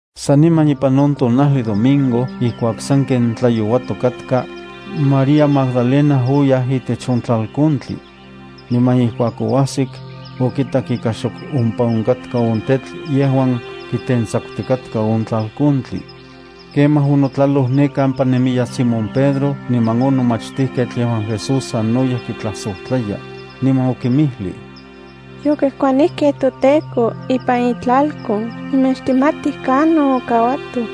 Saniman ipan on tonajli domingo ijkuak sanken tlayouatok katka, María Magdalena oyaj itech on tlalkontli. Niman ijkuak oajsik, okitak ika xok ompa onkatka on tetl yejuan kitentsakutikatka on tlalkontli. Kemaj onotlaloj ne kampa nemiyaj Simón Pedro niman on nomachtijketl yejuan Jesús sanoyej kitlajsojtlaya, niman okinmijlij: —Yokejkuanijkej toTEKO ipan itlalkon niman xtikmatij kanon okauatoj.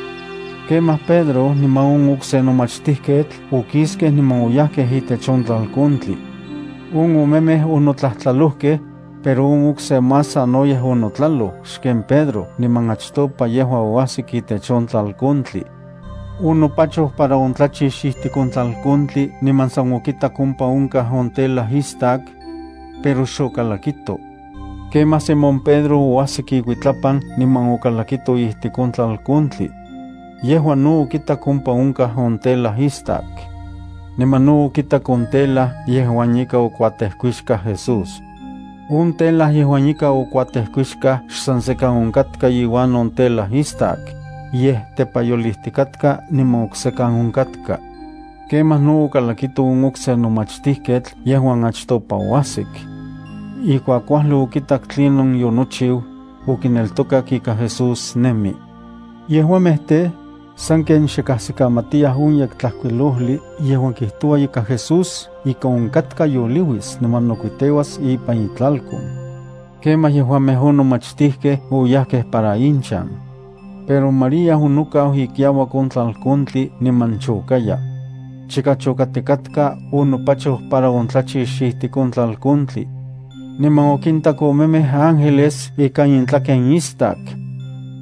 Kemaj Pedro niman on okse nomachtijketl okiskej niman oyajkej itech on tlalkontli. On omemej onotlajtlalojkej, pero on okse más sanoyej onotlaloj xken Pedro niman achtopa yejua oajsik itech on tlalkontli. Onopachoj para ontlachix ijtik on tlalkontli niman san okitak ompa onkaj on telas istakkej, pero xokalakito. Kemaj Simón Pedro oajsik ikuitlapan niman okalakito ijtik on tlalkontli. Yejua no okitak ompa onkaj on telas istakkej. Niman no okitak on tela yejuan ika okuatejkuixkaj Jesús. On tela yejuan ika okuatejkuixkaj xsan sekan onkatka iuan on telas istakej, yej tepayolijtikatka niman oksekan onkatka. Kemaj no okalakito on okse nomachtijketl yejuan achtopa oajsik. Ijkuak kuajli okitak tlinon yonochiu, okineltokak ika Jesús nemi. Yejuamej tej, sanken xe kajsikamatiyaj on Yektlajkuilojli yejuan kijtoua ika Jesús ika onkatka yoliuis niman nokuiteuas ipan itlalkon. Kemaj yejuamej on nomachtijkej oyajkej para inchan. Pero María onokau ikiauak on tlalkontli niman chokaya. Chika chokatikatka onopachoj para ontlachix ijtik on tlakontli, niman okintak omemej ángeles ikan intlaken istak.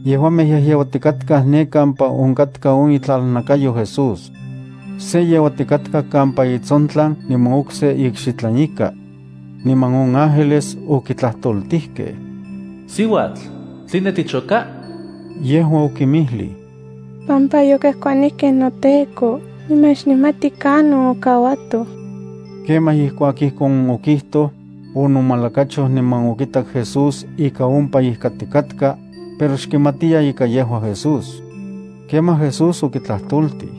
Yejuamej yejyeuatikatkaj ne kampa onkatka on itlalnakayo Jesús. Se yeuatikatka kampa itsontlan niman okse ikxitlan ika. Niman on ángeles okitlajtoltijkej: —Siuatl, ¿tline tichoka? Yejua okinmijlij: —Pampa yokejkuanijkej noTEKO niman xnikmati kanon okauatoj. Kemaj ijkuak ijkon okijtoj, onomalakachoj niman okitak Jesús ika ompa ijkatikatka, pero xkimatiya ika yejua Jesús. Kemaj Jesús okitlajtoltij: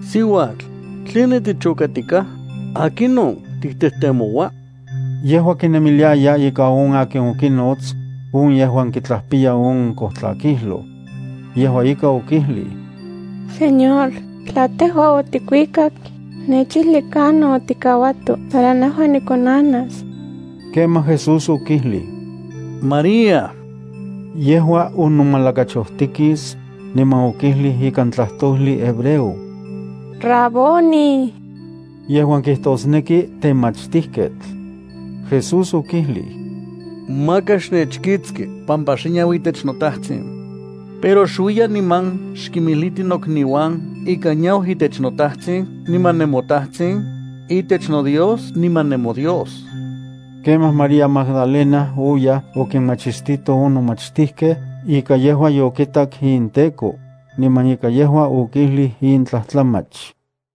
—Siuatl, ¿tline tichokatikaj? ¿Akinon tiktejtemoua? Yejua kinemiliaya ika on akin okinots, on yejuan kijtlapiya on kojtlakijloj. Yejua ika okijlij: —Señor, tla tejua otikuikak, xnechijli kanon otikauato para nejua nikonanas. Kemaj Jesús okijlij: —¡María! Yejua onomalakachojtikis, niman okijlij ikan tlajtojli hebreo: —¡Raboni! —yejuan kijtosneki “Temachtijketl”. Jesús okijlij: —Maka xnechkiktsi pampa xe niau itech noTajtsin. Pero xuiya niman xkimijliti nokniuan ika yeniau itech noTajtsin niman nemoTajtsin, itech noDios niman nemoDios. Kemaj María Magdalena oyaj okinmachistito on nomachtijkej ika yejua yokitak inTEKO, niman ika yejua okijlij in tlajtlamach.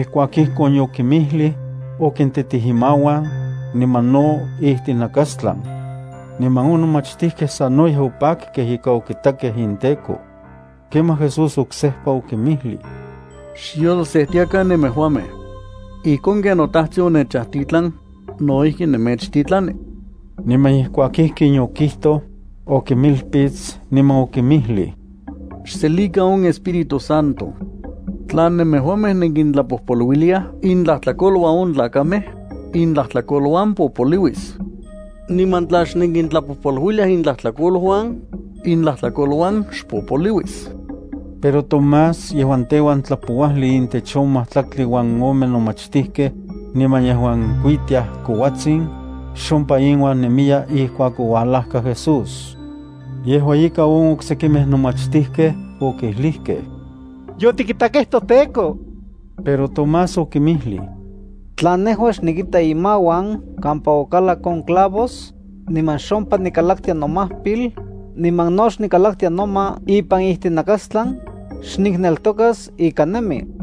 Ijkuak ijkon yokinmijlij, okintitij imauan, niman no ijtinakastlan. Niman on nomachtijkej sanoyej opakkej ika okitakej inTEKO. Kemaj Jesús oksejpa okinmijlij: —Xyolsejtiakan nemejuamej. Ijkon ken noTajtsin onechajtitlan, no ijki nemechtitlani. Niman ijkuak ijkin yokijtoj, okinmilpits niman okinmijlij: —Xselikan on Espíritu Santo. Tla nemejuamej nenkintlapojpoluiliaj intlajtlakoluan on tlakamej, intlajtlakoluan popoliuis. Niman tla xnenkintlapojpoluiliaj intlajtlakoluan, intlajtlakoluan xpopoliuis. Pero Tomás yejuan teuan tlapouajli intech on majtlaktli uan ome nomachtijkej, niman yejuan kuitiaj kouatsin, xompa inuan nemiya ijkuak oualajka Jesús. Yejua ika on oksekimej nomachtijkej okijlijkej: —Yotikitakej toTEKO. Pero Tomás okinmijlij: —Tla nejua xnikita imauan kampa okalak on clavos, niman xompa nikalaktia nomajpil, niman no xnikalaktia noma ipan ijtinakastlan, xnikneltokas ika nemi.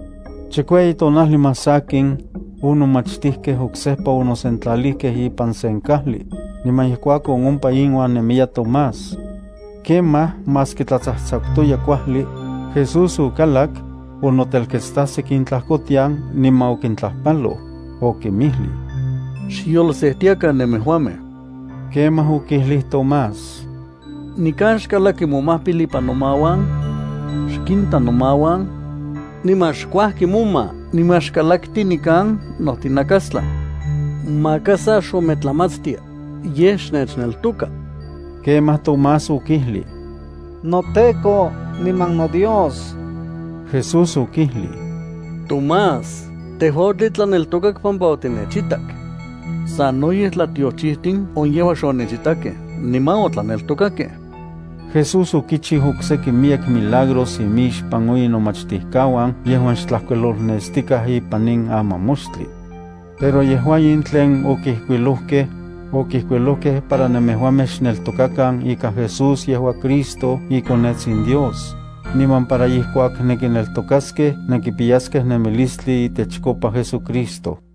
Chikueyi tonajli más sakin, on nomachtijkej oksejpa onosentlalijkej ipan sen kajli, niman ijkuakon ompa inuan nemiya Tomás. Kemaj, maski tlatsajtsakutoya kuajli, Jesús okalak, onotelketstajsik intlajkotian niman okintlajpaloj, okinmijlij: —Xyolsejtiakan nemejuamej. Kemaj okijlij Tomás: —Nikan xkalakti momajpil ipan nomauan. Xkinta nomauan. Niman xkuajki moma niman xkalakti nikan nojtinakastlan. Maka sa xometlamatstia, yej xnechneltoka. Kemaj Tomás okijlij: —¡NoTEKO niman noDios! Jesús okijlij: —Tomás, tejua otitlaneltokak pampa otinechitak. Sanoyej tlatiochijtin on yejuan xonechitakej niman otlaneltokakej. Jesús okichiu okseki miyek milagros imixpan on inomachtijkauan yejuan xtlajkuilolnestikaj ipan in amamoxtli. Pero yejua in tlen okijkuilojkej, okijkuilojkej para nemejuamej xneltokakan ika Jesús yejua Cristo iKonetsin Dios, niman para ijkuak nenkineltokaskej nenkipiyaskej nemilistli itechkopa JesuCristo.